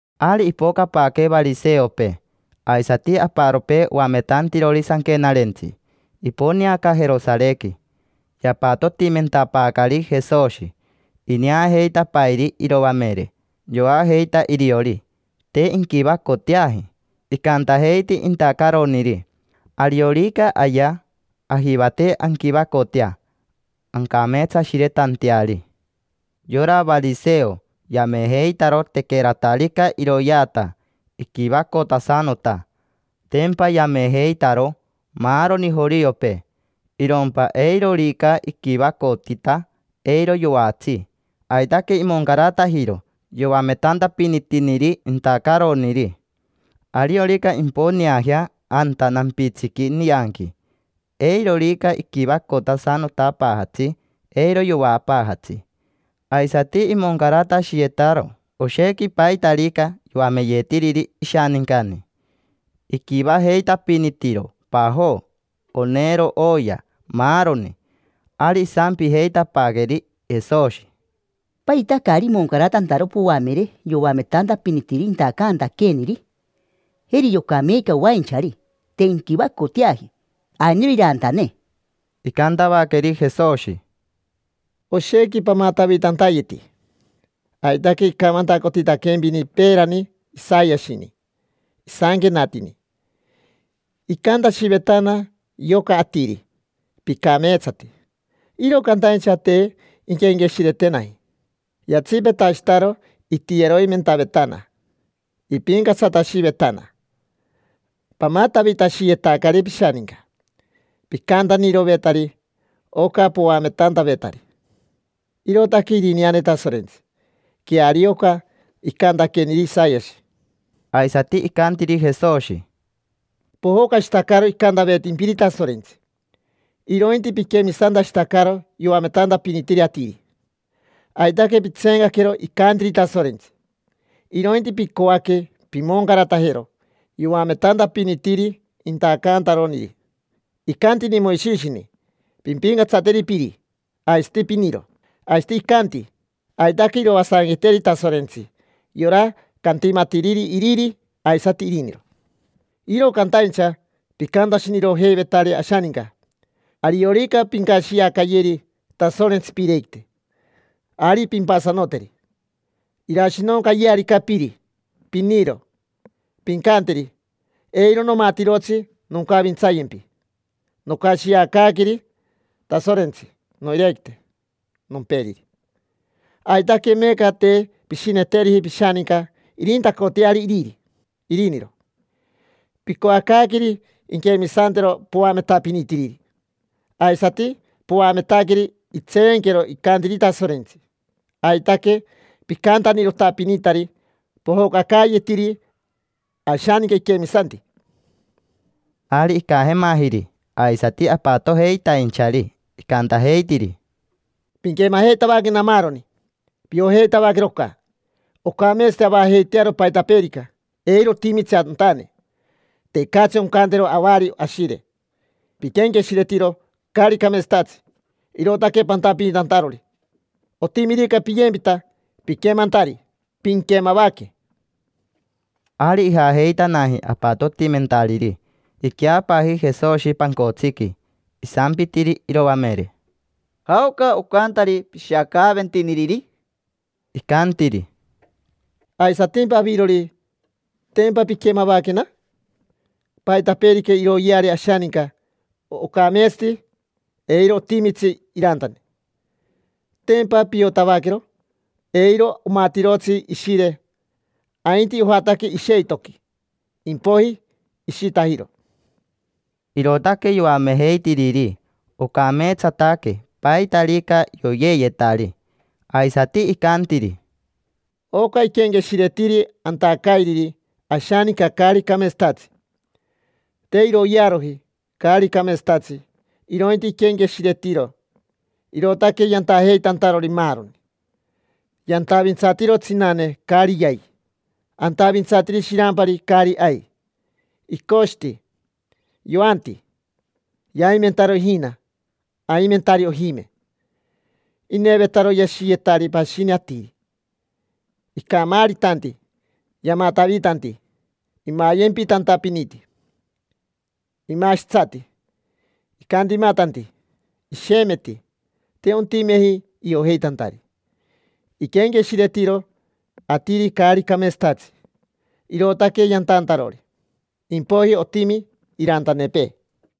Ari ipocapaaque variseopee, aisati aparopee oametantirori sanquenarentsi, iponeaca Jerosarequi. Yapatotimentapaacari Jesoshi. Ineajeitapairi iroamere, yoajeita iriori: te inquivacoteaji. Icantajeiti intacaroniri: “Ariorica ayea, ajivate anquivacotea ancameetsashiretanteari”. Yora variseo yamejeitaro tequeratarica iroyeata, iquivacotasanota. Tempa yamejeitaro maaroni joriopee. Irompa eirorica iquivacotita, eiro yoatsi. Aitaque imoncaratajiro yoametantapinitiniri intacaroniri. Ariorica imponeajea anta nampitsiqui nianqui, eirorica iquivacotasanotapaajatsi, eiro yoapaajatsi. Aisati imoncaratashiyetaro oshequi paitarica yoameyetiriri ishanincani. Iquivajeitapinitiro pajo, onero, oya, maaroni. Ari isampijeitapaaqueri Jesoshi: —¿Paita caari imoncaratantaro poamere yoametantapinitiniri intacantaqueeniri? Jeri yoca meeca oainchari, te inquivacoteaji: ainiro irantane. Icantavaqueri Jesoshi: —Oshequi pamatavitantayeti. Aitaque icamantacotitaquempini peerani Isayashini. Isanquenatini: “Icantashivetana yoca atiri: ‘Picameetsati’, iro cantaincha te inquenqueshiretenaji. Yatsipetashitaro itiyeroimentavetana; ipincatsatashivetana. Pamatavitashiyetacari pishaninca: picantanirovetari oca poametantavetari irootaque irineane Tasorentsi”. Queario oca icantaqueniri Isayashi. Aisati icantiri Jesoshi: —Pojocashitacaro icantavetimpiri Tasorentsi, irointi piquemisantashitacaro yoametantapinitiri atiri. Aitaque pitseencaquero icantiri Tasorentsi, irointi picoaque pimoncaratajero yoametantapinitiri intacantaroniri. Icantini Moishishini: “Pimpincatsateri piri, aisati piniro”. Aisati icanti: “Aitaque iroasanqueteri Tasorentsi yora cantimatiriri iriri aisati iriniro”. Iro cantaincha picantashinirojeivetari ashaninca: “Ariorica pincashiacayeri Tasorentsi piirequite, ari pimpasanoteri. Irashinoncayearica piri, piniro, pincanteri: ‘Eiro nomatirotsi noncavintsayempi: nocashiacaaqueri Tasorentsi noirequite nomperiri’”. Aitaque meeca te pishineteriji pishaninca irintacoteari iriri, iriniro. Picoacaaqueri inquemisantero poametapinitiriri, aisati poametaqueri intseenquero icantiri Tasorentsi. Aitaque picantanirotapinitari: pojocacaayetiri ashaninca iquemisanti. Ari icajemajiri aisati apatojeitainchari, icantajeitiri: —Pinquemajeitavaquena maaroni. Piojeitavaquero oca. Ocameetsati avajeitearo paitapeerica, eiro otimitsi antane: tecatsi oncantero avari ashire. Piquenqueshiretiro caari cameetsatatsi, irootaque pantapinitantarori. Otimirica piyempita piquemantari, pinquemavaque. Ari ijajeitanaji apatotimentariri, iqueapaaji Jesoshi pancotsiqui. Isampitiri iroamere: —¿Jaoca ocantari pishiacaaventiniriri? Icantiri: —Aisatimpa avirori, ¿tempa pinquemavaquena? Paitapeerica iroyeari ashaninca, ocameetsati, eiro otimitsi irantane. Tempa piotavaquero. Eiro omatirotsi ishire, ainti ojataque isheitoqui, impoiji ishitajiro. Irootaque yoamejeitiriri ocameetsataque paitarica yoyeeyetari. Aisati icantiri: —Oca iquenqueshiretiri antacairiri ashaninca caari cameetsatatsi. Te iroyearoji caari cameetsatatsi, irointi iquenqueshiretiro. Irootaque yantajeitantarori maaroni: yantavintsatiro tsinane caari yai, antavintsatiri shirampari caari ai, icoshiti, yoanti. Yaimentaro ijina, aimentari ojime. Inevetaro yashiyetari pashini atiri. Icamaaritanti, yamatavitanti, imayempitantapiniti, imashitsati, icantimatanti, ishemeti. Te ontimeji iojeitantari. Iquenqueshiretiro atiri caari cameetsatatsi, irootaque yantantarori: impoiji otimi irantanepee.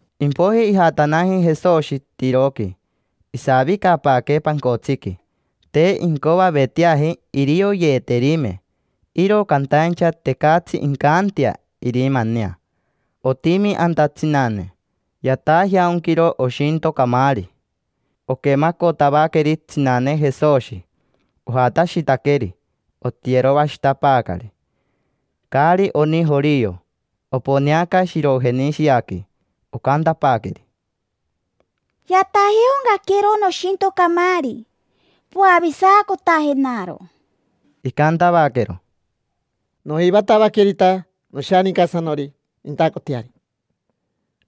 Impoiji ijatanaji Jesoshi Tiroqui. Isavicapaaque pancotsiqui, te incoaveteaji irioyeeterime. Iro cantaincha tecatsi incantea irimanea. Otimi anta tsinane, yatajeaonquiro oshinto camaari. Oquemacotavaqueri tsinane Jesoshi, ojatashitaqueri, otiyeroashitapaacari. Caari oni jorio, oponeaca Shirojenishiaqui. Ocantapaaqueri: —Yatajeaoncaquero noshinto camaari, poavisacotajenaro. Icantavaquero: —Nojivatavaquerita noshanincasanori nintacoteari.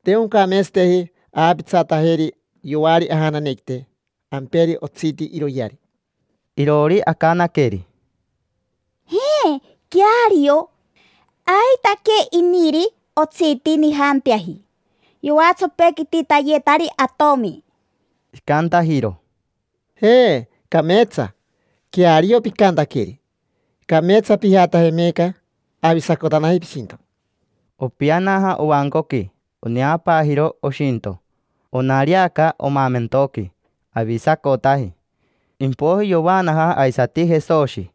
Te oncameetsateji aapitsatajeri yoari ajananequite, amperi otsiti iroyeari. Iroori acanaqueri: —Je, queario. Aitaque iniri otsiti nijanteaji. Yoatsopequititayetari atomi. Icantajiro: —Je, cameetsa; queario picantaqueri. Cameetsa pijataje meeca, avisacotanaji pishinto. Opianaja ovancoqui. Oneapaajiro oshinto, onariaca omaamentoqui, avisacotaji. Impoiji yovaanaja aisati Jesoshi,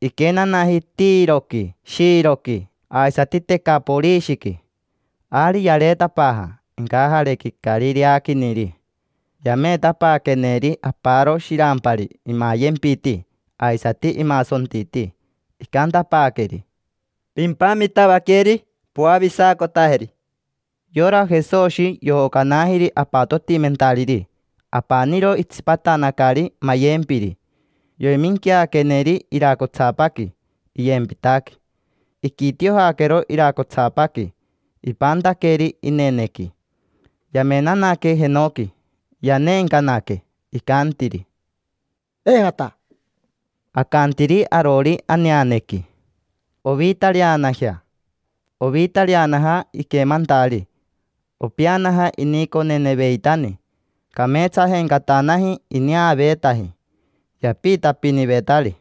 iquenanaji Tiroqui, Shiroqui aisati Tecaporishiqui. Ari yareetapaaja incajarequi Carireaquiniri. Yameetapaaqueneri aparo shirampari imayempiti, aisati imasontiti. Icantapaaqueri: —Pimpamitavaqueri, poavisacotajeri. Yora Jesoshi yojocanajiri apatotimentariri, apaniro itsipatanacari mayempiri. Yoiminquiaqueneri iracotsapaqui iyempitaqui. Iquitiojaquero iracotsapaqui, ipantaqueri inenequi. Yamenanaque jenoqui, yaneencanaque, icantiri: —Epeta. Acantiri arori aneanequi: “Ovitareanajea”. Ovitareanaja iquemantari. Opeanaja iniconeneveitani, cameetsajencatanaji ineaveetaji. Yapiitapinivetari: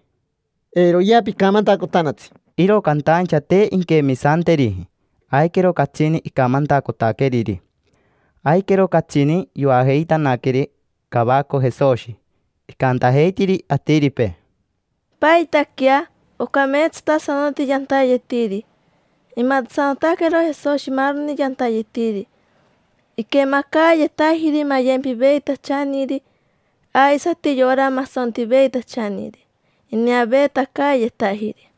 —Eiroyea picamantacotanatsi. Iro cantaincha te inquemisanteriji, aiquero catsini icamantacotaqueriri. Aiquero catsini yoajeitanaqueri cavaco Jesoshi. Icantajeitiri atiripee: —Paitaquea, ocameetsatasanoti yantayetiri. Imatasanotaquero Jesoshi maaroni yantayetiri. Iquemacaayetajiri mayempiveitachaniri, aisati yora masontiveitachaniri, ineaveetacaayetajiri.